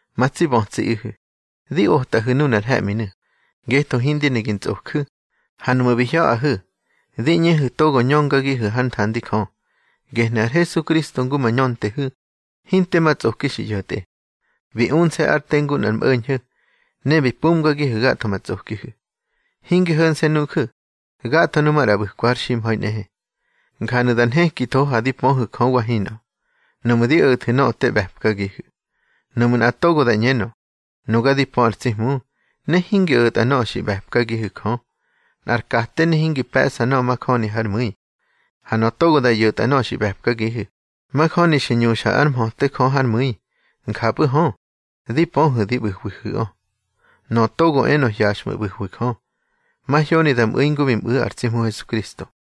Ma tsi bötsiꞌihu̱, di otꞌahu̱ nunar he̱ꞌminu̱, ngetho hindi ne gi ntsꞌoju̱. Ha nuꞌmu̱ bi hya̱ꞌahu̱, di ꞌñehu̱ togo ñöngagihu̱ hár nthandi Jö. Gehnu̱ ar Hesukristo ngu ma ñöntehu̱, hinte ma tsꞌoki xi ꞌyo̱tꞌe. Bi unse̱ ár te ngu nꞌar mꞌo̱ñho̱, ne bi mpumgagihu̱ gatho ma tsꞌokihu̱. Hinge ho̱nse̱ nuju̱, gatho nu maꞌra ꞌbu̱kwa har ximha̱i nꞌehe. Njanu̱ da nhekitho ha di pöhu̱ Jö wa hinꞌö, nuꞌmu̱ di o̱thu̱ nöꞌö te ꞌbe̱pkagihu̱. Nuꞌmu̱ nꞌa togo da ꞌñenö: Nuga di pö ar tsi Hmu, ne hingi o̱tꞌa nöꞌö xi ꞌbe̱pkagihu̱ Jö, nꞌar kate ne hingi pe̱ꞌsa nöꞌö majöni hár mu̱i. Ha nöꞌö togo da ꞌyo̱tꞌa nöꞌö xi ꞌbe̱pkagihu̱, majöni xi ñuxa ár mhöte Jö hár mu̱i. Njapꞌu̱ hö, di pöhu̱ di ꞌbu̱hwihu̱ꞌö. Nöꞌö togo enö hyaxꞌmu̱ ꞌbu̱hwi Jö, mahyoni da mꞌu̱i ngu bi mꞌu̱ ar tsi Hmu Hesukristo.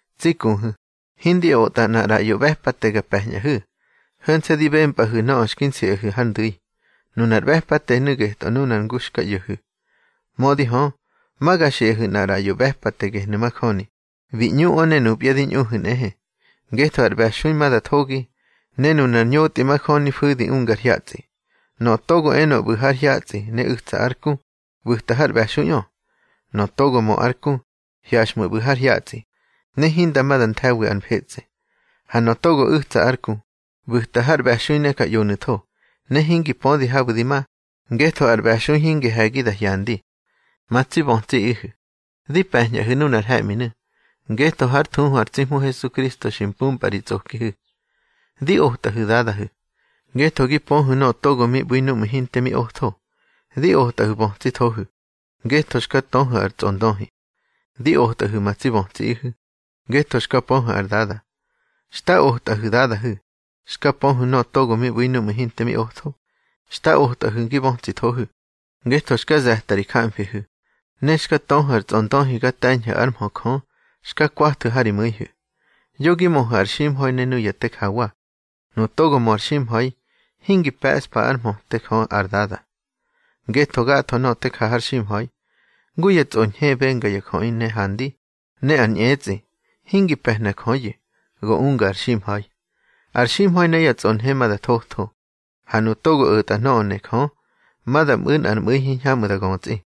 Tsi kuhu̱, hindi otꞌa nꞌar ꞌraꞌyo ꞌbe̱pate ga pe̱ñꞌahu̱, ho̱nse̱ di bempꞌahu̱ nöꞌö xki nsiꞌahu̱ har ndu̱i. Nunar ꞌbe̱patenu̱ getꞌö ngu nuna xka ꞌyo̱hu̱. Mödi hö, ma ga xiꞌahu̱ nꞌar ꞌraꞌyo ꞌbe̱pate gehnu̱ majöni, bi ñꞌuꞌö ne nupya di ꞌñuhu̱ nꞌehe. Ngetho ar ꞌbe̱xui ma da thogi, ne nunar ñotꞌi majöni fu̱di ungar hyatsꞌi. Nöꞌö togo enö ꞌbu̱ har hyatsꞌi ne u̱tsa ár ku, ꞌbu̱ta har ꞌbe̱xuiꞌö. Nöꞌö togo mö ár ku, hyaxꞌmu̱ ꞌbu̱ har hyatsꞌi, ne hinda ma da nthe̱wi ar mfetsꞌe. Ha nöꞌö togo u̱tsa ár ku, ꞌbu̱ta har ꞌbe̱xui ne ja ꞌyonu̱tho. Ne hingi pödi habu̱ di ma, ngetho ar ꞌbe̱xui hingi he̱gi da hyandi. Ma tsi bötsiꞌihu̱, di pe̱ñꞌahu̱ nunar he̱ꞌminu̱, ngetho hár thuhu ar tsi Hmu Hesu xi mpumpꞌa ri tsꞌokihu̱. Di otꞌahu̱ dadahu̱, ngetho gi pöhu̱ nöꞌö togo mi ꞌbu̱i núꞌmu̱ hinte mi otho. Di otꞌahu̱ bötsithohu̱, ngetho xka töhu̱ ar tsꞌondöhi. Di otꞌahu̱ ma tsi bötsiꞌihu̱, ngetho xka pöhu̱ ar Dada. Xta otꞌahu̱ dadahu̱, xka pöhu̱ nöꞌö togo mi ꞌbu̱i núꞌmu̱ hinte mi otho. Xta otꞌahu̱ gi bötsithohu̱, ngetho xka ze̱ta ri jamfihu̱, ne xka töhu̱ ar tsꞌondöhi ga te̱ñhu̱ ár mhö Jö xka kwathu̱ ha ri mu̱ihu̱. Yo gi möhu̱ ar ximha̱i ne nuya te jawa. Nu togo mö ar ximha̱i, hingi pe̱ꞌspa ár mhöte Jö ar Dada. Ngetho gatho nöꞌö te ja har ximha̱i, ngu ya tsꞌonhe benga ya jöꞌi ne handi, ne ar ñꞌetsꞌi, hingi pe̱hna Jöyu̱, go unga ar ximha̱i. Ar ximha̱i ne yá tsꞌonhe ma da thotho, ha nuꞌu̱ togo o̱tꞌa nöꞌö ne Jö, ma da mꞌu̱ nꞌar mꞌu̱i hiñhamꞌu̱ da götsꞌi.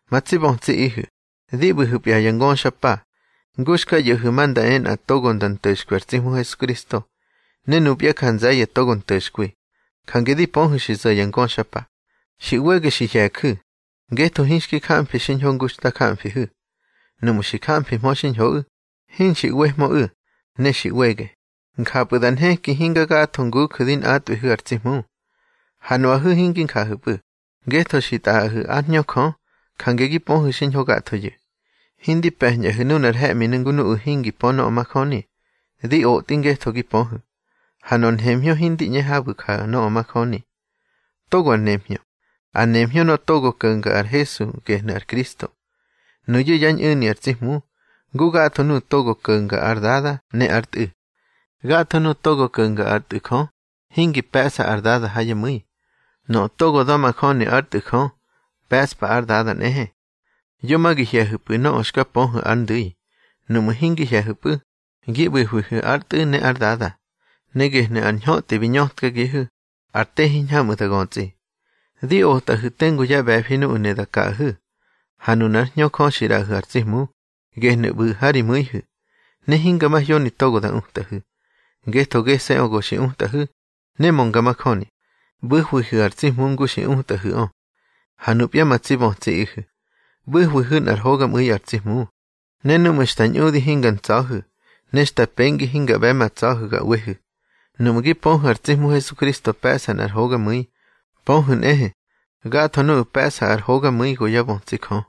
Ma tsi bötsiꞌihu̱, di ꞌbu̱hu̱pya ya ngöxapa. Ngu xka ꞌyo̱hu̱ ma nda e nꞌa togo nda nto̱xkwi ar tsi Hmu Hesukritso, ne nupya ja nze̱ye̱ togo nto̱xkwi. Jange di pöhu̱ xi zo̱ ya ngöxapa. Xi ꞌwege xi hye̱ju̱, ngetho hinxki jamfi xiñho ngu xta jamfihu̱. Nuꞌmu̱ xi jamfihmö xiñhoꞌu̱, hinxi ꞌwehmöꞌu̱. Ne xi ꞌwege, njapu̱ da nheki hinga gatho nguju̱ di nꞌatꞌwihu̱ ar tsi Hmu. Ha nuꞌahu̱ hingi njahu̱pꞌu̱, ngetho xi tꞌaꞌahu̱ ár Hñö Jö, jange gi pöhu̱ xiñho gathoyu̱. Hindi pe̱ñꞌahu̱ nunar he̱ꞌminu̱ ngu nuꞌu̱ hingi pö nöꞌö majöni. Di otꞌi ngetho gi pöhu̱, ha nor nhemhñö hindi ꞌñe habu̱ ja nöꞌö majöni. Togo ar nemhñö. Ar nemhñö nöꞌö togo ko̱nga ar Hesu gehnu̱ ar Kristo. Nuyu̱ yá ñꞌu̱ni ar tsi Hmu, ngu gatho nuꞌu̱ togo ko̱nga ar Dada ne ár Tꞌu̱. Gatho nuꞌu̱ togo ko̱nga ár Tꞌu̱ Jö, hingi pe̱ꞌsa ar Dada ha yá mu̱i. Nöꞌö togo da̱majöni ár Tꞌu̱ Jö, pe̱ꞌspa ár Dada nꞌehe. Yo ma gi hye̱hu̱pꞌu̱ nöꞌö xka pöhu̱ ár ndu̱i. Nuꞌmu̱ hingi hye̱hu̱pꞌu̱, gi ꞌbu̱hwihu̱ ár Tꞌu̱ ne ar Dada. Ne gehnu̱ ar ñhötꞌi bi ñötkagihu̱: ar te hiñhamꞌu̱ da götsꞌi. Di otꞌahu̱ tengu yá ꞌbe̱fi nuꞌu̱ ne da kaꞌahu̱. Ha nunár Hñö Jö xi ꞌraꞌahu̱ ar tsi Hmu, gehnu̱ ꞌbu̱ ha ri mu̱ihu̱. Ne hinga mahyoni togo da utꞌahu̱, ngetho gese̱ꞌö go xi utꞌahu̱, ne mönga majöni. ꞌBu̱hwihu̱ ar tsi Hmu ngu xi utꞌahu̱ꞌö. Ha nupya ma tsi bötsiꞌihu̱, ꞌbu̱hwihu̱ nꞌar hogamꞌu̱i ar tsi Hmu, ne núꞌmu̱ xta ñꞌudi hinga ntsa̱hu̱, ne xta pengi hinga ꞌbe̱ ma tsa̱hu̱ ga ꞌwehu̱. Nuꞌmu̱ gi pöhu̱ ar tsi Hmu Hesukristo pe̱ꞌsa nꞌar hogamu̱i, pöhu̱ nꞌehe, gatho nuꞌu̱ pe̱ꞌsa ar hogamu̱i go yá bötsi Jö.